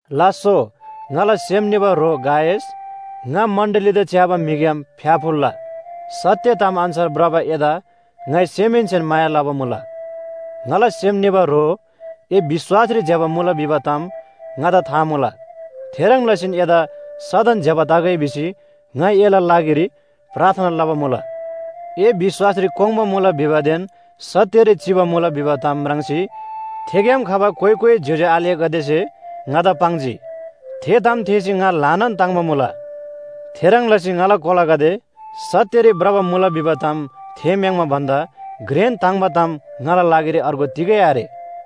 लास्‍सो ङाला सेम निबा ह्रो गायस, ङा मण्‍डलीदा च्‍याबा म्‍हिग्‍याम फ्‍याफुल्‍ला! सत्‍य ताम अन्‍छार भ्रबा एदा ङाइ सेमहेन्‍सेन माया लबा मुला। ङाला सेम निबा ह्रो, ए विश्‍वासरी ज्‍यबा मुला भिबा ताम ङादा था मुला। थेह्रङ् लसीन एदा सदन ज्‍यबा तगै भिसी ङाइ एला लागिरी प्रार्थना लबा मुला। ए विश्‍वासरी कोङ्बा मुला भिबादेन सत्‍यरी चिबा मुला भिबा ताम म्राङ्सी थेग्‍याम खबा कोइ कोइ ज्‍योज्‍यो आलेगदेसे ङादा पाङ्जी। थे ताम थेःसी ङा ल्‍हानान ताङ्‍बा मुला। थेह्रङ् लसी ङाला कोलागदे सत्‍यरी भ्रबा मुला भिबा ताम थेःम्‍याङ्बा भन्‍दा घ्रेन ताङ्‍बा ताम ङाला लागिरी अर्गु तिगै आरे।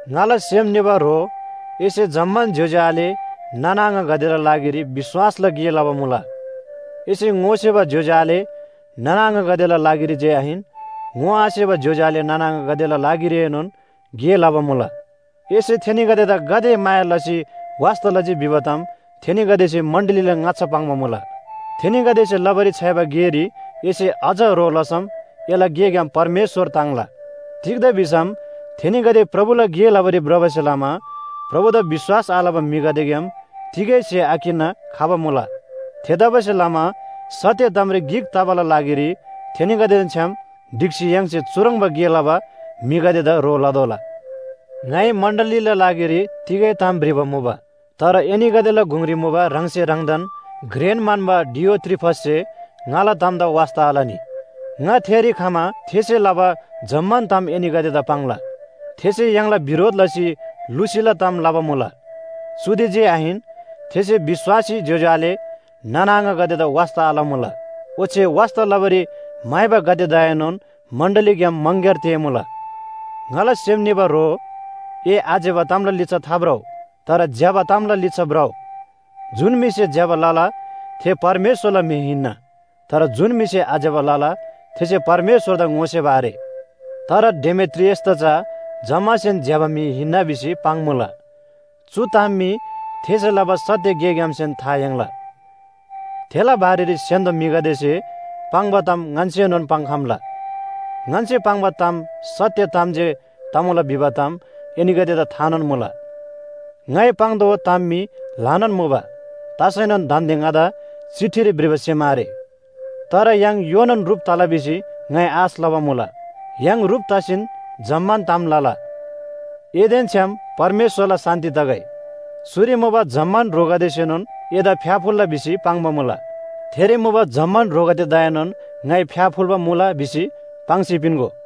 ङाला सेम निबा ह्रो, एसे जम्‍मान ज्‍योज्‍यो आले नाना आङागदेला लागिरी विश्‍वासला गे लबा मुला। एसे ङोसेबा ज्‍योज्‍यो आले नाना आङागदेला लागिरी जे आहिन, ङोआसेबा ज्‍योज्‍यो आले नाना आङागदेला लागिरीएनोन गे लबा मुला। एसे थेनीगदेदा गाते माया लसी वास्‍ता लजी भिबा ताम थेनीगदेसे मण्‍डलीला ङाच्‍छा पाङ्बा मुला। थेनीगदेसे लबारी छ्‌याइबा गेरी एसे अझ ह्रो लसम एला गेग्‍याम परमेश्‍वर ताङ्ला। तिग्‍दा भिसम थेनीगदे प्रभुला गे लबारी भ्रबासे लमा प्रभुदा विश्‍वास आलबा म्‍हिगदेग्‍याम तिगै स्‍हे आकिन्‍ना खबा मुला। थेतबासेलमा सत्‍य तामरी गिक तबाला लागिरी थेनीगदेदेन छ्‌याम ढिक्‍सी य्‍हाङसे चुह्रङ्बा गे लबा म्‍हिगदेदा ह्रो लतोःला। ङाइ मण्‍डलीला लागिरी तिगै ताम भ्रिबा मुबा। तर एनीगदेला गुङरी मुबा ह्राङसे ह्राङदान घ्रेन म्‍हन्‍बा डियोत्रिफससे ङाला तामदा वास्‍ता आलनी। ङा थेरी खमा थेसे लबा जम्‍मान ताम एनीगदेदा पाङ्ला। थेसे य्‍हाङला बिरोध लसी लुसीला ताम लबा मुला। चुदे जे आहिन, थेसे विश्‍वासी ज्‍योज्‍यो आले नाना आङागदेदा वास्‍ता आलमुला। ओच्‍छे वास्‍ता लबारी म्‍हाइबागदेदाएनोन मण्‍डलीग्‍याम मङग्‍यार तेःमुला। ङाला सेम निबा ह्रो, ए आज्‍यबा तामला लिच्‍छा थाभ्रउ, तर ज्‍यबा तामला लिच्‍छा भ्रउ। जुन म्‍हिसे ज्‍यबा लला थे परमेश्‍वरला म्‍हि हिन्‍ना। तर जुन म्‍हिसे आज्‍यबा लला थेसे परमेश्‍वरदा ङोसेबा आरे। तर डेमेत्रियसदा चा जम्‍मासेन ज्‍यबा म्‍हि हिन्‍ना भिसी पाङ्‌मुला, चु ताम मी थेसे लबा सत्‍य गेग्‍यामसेन था याङ्ला। थेला बारेरी स्‍य्‍हान्‍दो म्‍हिगदेसे पाङ्बा ताम ङन्‍सेनोन पाङ्‌खम्‍ला। ङन्‍से पाङ्बा ताम सत्‍य ताम जे तमुला भिबा ताम एनीगदेदा थानोन मुला। ङाइ पाङ्तोःबा ताम मी ल्‍हानान मुबा। तसैनोन दान्‍दे ङादा चिठीरी भ्रिबा सेम आरे। तर य्‍हाङ योनान ह्रुप तला भिसी ङाइ आश लबा मुला, य्‍हाङ ह्रुप तसीन जम्‍मान ताम लला। एदेन छ्‌याम परमेश्‍वरला शान्‍ति तगै। चुरी मुबा जम्‍मान ह्रोगदेसेनोन एदा फ्‍याफुल्‍ला भिसी पाङ्बा मुला। थेरी मुबा जम्‍मान ह्रोगदेदाएनोन ङाइ फ्‍याफुल्‍बा मुला भिसी पाङ्सी पिन्‍गो।